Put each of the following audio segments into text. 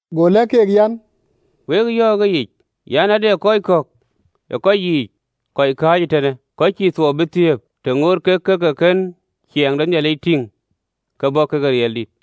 Go lɛ̈k keek an, “Wek yɔ̈ɔ̈k ëyic an, Ade kɔc kɔ̈k ë kɔc yiic kɔc kääc eetënë, kɔc cï thuɔɔu bï thiëëp, të ŋoot kek ke ke kën ciɛɛŋ de Nhialic tïŋ ke bɔ̈ kekë riɛldït.”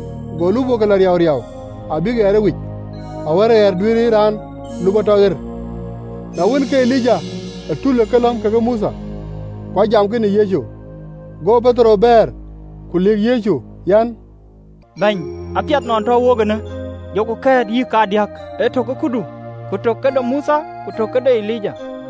go lupɔɔke lɔ riauriau, abïk ɣɛɛr ëwic, awär ɣɛɛr duëër raan lupɔɔ tɔ ɣer. Na wën, ke Elija tul ë kelɔ̈m kekë Mothe: ku ajamkï në Yecu. Go Petero bɛ̈ɛ̈r, ku lëk Yecu an, “Bɛ̈ny, apiɛth nɔn tɔ̈u wok eenë: jɔku kɛ̈ɛ̈t yïk kadiäk, ye tök këdu, ku tök këde Mothe, ku tök këde Elija.”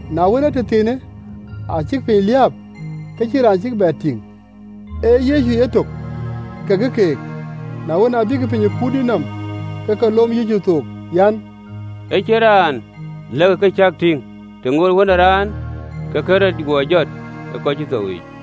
Na wën, ee tëthiinë, acïk piny liääp, ke cïn raan cïk bɛ tïŋ, ee Yecu etök kekë keek. Na wën, abïk piny ë kuurdït nɔm, ke ke lom Yecu thook an, “Ë cïn raan lɛ̈kkï ka cäk tïŋ, të ŋootë Wën ë Raan ke kën rɔt guɔ jɔt ë kɔc cï thou yiic.”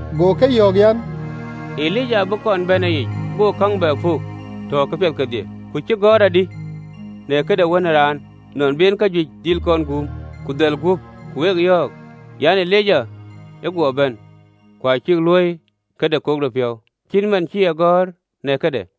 Go ke yɔ̈ɔ̈k an, “Elija abï kɔn bɛ̈n ëyic, go käŋ bɛ puk tɔ ke piɛth kedhie: ku cï gɔ̈ɔ̈r adï në këde Wën ë Raan, nɔn bï en kajuëc dhil guum, ku dhäl guöp? Ku wek yɔ̈ɔ̈k an, Elija ë guɔ bɛ̈n, ku acïk luöi këde kepiɔ̈ɔ̈th, cït man cï e gɔ̈ɔ̈r në këde.”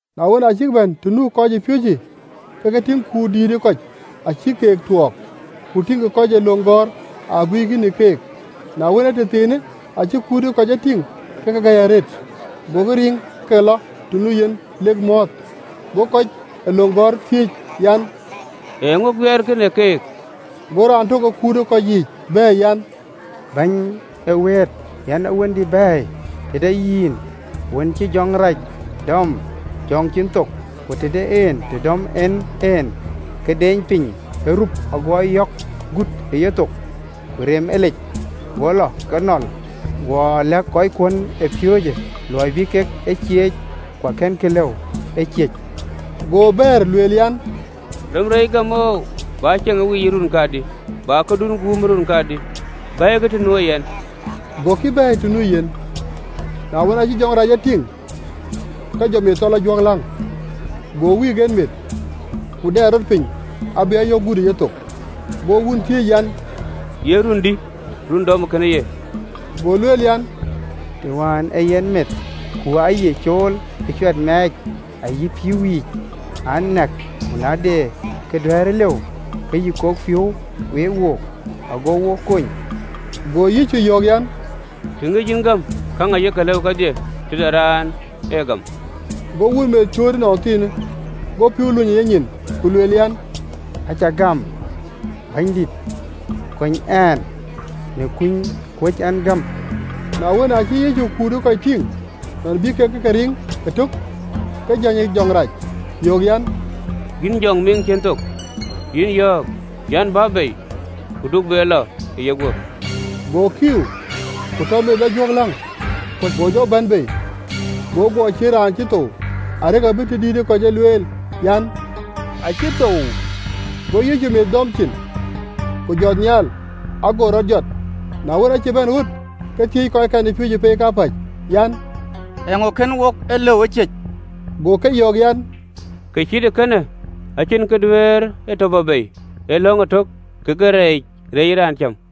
Na wën, aa cïk bɛ̈n të nu kɔcpiööcë, ke ke tïŋ kut dïït ë kɔc acïk keek tuɔɔk, ku tïŋkï kɔc ee löŋ gɔ̈ɔ̈r ateerkï në keek. Na wën, ee tëthiinë, acï kut ë kɔc e tïŋ, ke ke gäi arëët, gokï riŋ ke ke lɔ të nu yen lek mɔ̈ɔ̈th. Go kɔc ee löŋ gɔ̈ɔ̈r thiëëc an, “Eeŋö guiɛɛrkï në keek?” Go raan tök ë kut ë kɔc yiic bɛ̈ɛ̈r an, “Bɛ̈ny ee wëët, yɛn ë wëndï bɛ̈ɛ̈i tëde yïn, wën cï jɔŋ rac dɔm jɔŋ cïn thok. Ku të de en të dɔm en en, ke deeny piny: ago ayɔ̈k gut ë yethok, ku reem e lec, go lɔ ke nɔl: guɔ lɛ̈k kɔckuön ë piööcë luɔi bï kek e cieec, ku akënkï lëu ë ciëc.” Go bɛ̈ɛ̈r, lueel an, “Rem reec gäm oou! Bä ceŋ ë weyiic ë run kadï? Bä këdun guum ë run kadï? Bɛ̈ɛ̈ikï të nuö yɛn!” Gokï bɛ̈ɛ̈i të nu Yecu. Na wën, aacï jɔŋ rac Yecu tïŋ, ke jɔ meth tɔ lɔ juɔ̈kläŋ, go meth wïïk, ku dɛɛl rɔt piny abï ayɔ̈k gut ë yethok. Go wun thiëëc an, “Ye run dï run ë dɔmë kënë ye?” Go lueel an, “Të wään ee yen meth. Ku aye cool ë cuat mɛɛc ayï pïïu yiic an, nɛ̈k. Ku na de kë duɛ̈ɛ̈rë lëu, ke yï kok piɔ̈u we wook, ago wo kony!” Go Yecu yɔ̈ɔ̈k an, “Të ŋic yïn gäm! Käŋ ayek lëu kedhie tëde raan ë gäm.” Go wun meth cööt ënɔnthiinë, go pïïu lony ë yenyin, ku lueel, an, “Acä gam, Bɛ̈nydït, kony ɛn në kuny kuöc ɛn gäm!” Na wën, aacï Yecu kut ë kɔc tïŋ nɔn bï kek ë ke riŋ ëtök, ke jäny jɔŋ rac yöök an, “Yïn jɔŋ miŋ cïn thok, yïn yɔ̈ɔ̈k an, Bä bei, ku du be lɔ ë yeguöp!” Go jɔŋ rac kiiu, ku tɔ meth lɔ juɔ̈kläŋ, ku jɔ bɛ̈n bei: arëk abï ë tëdït ë kɔc juëc e lueel an, “Raan acï thou!” Go Yecu meth dɔm ciin, ku jɔt nhial, ago rɔt jɔt. Na wën, aacï bɛ̈n ɣöt ke thiëëc kɔckɛn ë piööcë pei kapäc an, “Eeŋö kën wok e lëu ë ciëc?” Go ke yɔ̈ɔ̈k an, “Kë cït ee kënë acïn kë duëër e tɔ bɔ̈ bei, ee lɔ̈ŋ etök kekë rɛɛc reec ë raan cäm.”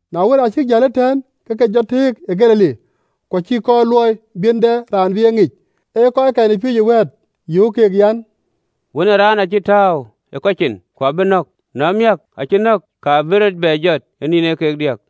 Na wën, aa cïk jäl ëtɛ̈ɛ̈n, ke ke jɔ tëëk ë Galili, ku acïï kɔɔr luɔi bï en dɛ raan bï e ŋic. Ee kɔc kɔckɛn ë piööcë wɛ̈ɛ̈t, yöök keek an, “Wën ë Raan acï tääu ë kɔc cin, ku abïk nɔ̈k, na miäk, aacï nɔ̈k, ka bï rɔt bɛ jɔt ë nïn ee kek diäk.”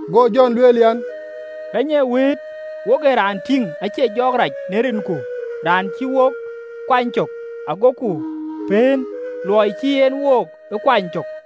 Go Jɔn lueel an, “Bɛ̈ny ee wëët, wo ë raan tïŋ aciec jɔɔk rac në rinku, raan cïï wook ë kuany cök: agoku pëën, luɔi cïï en wook ee kuany cök.”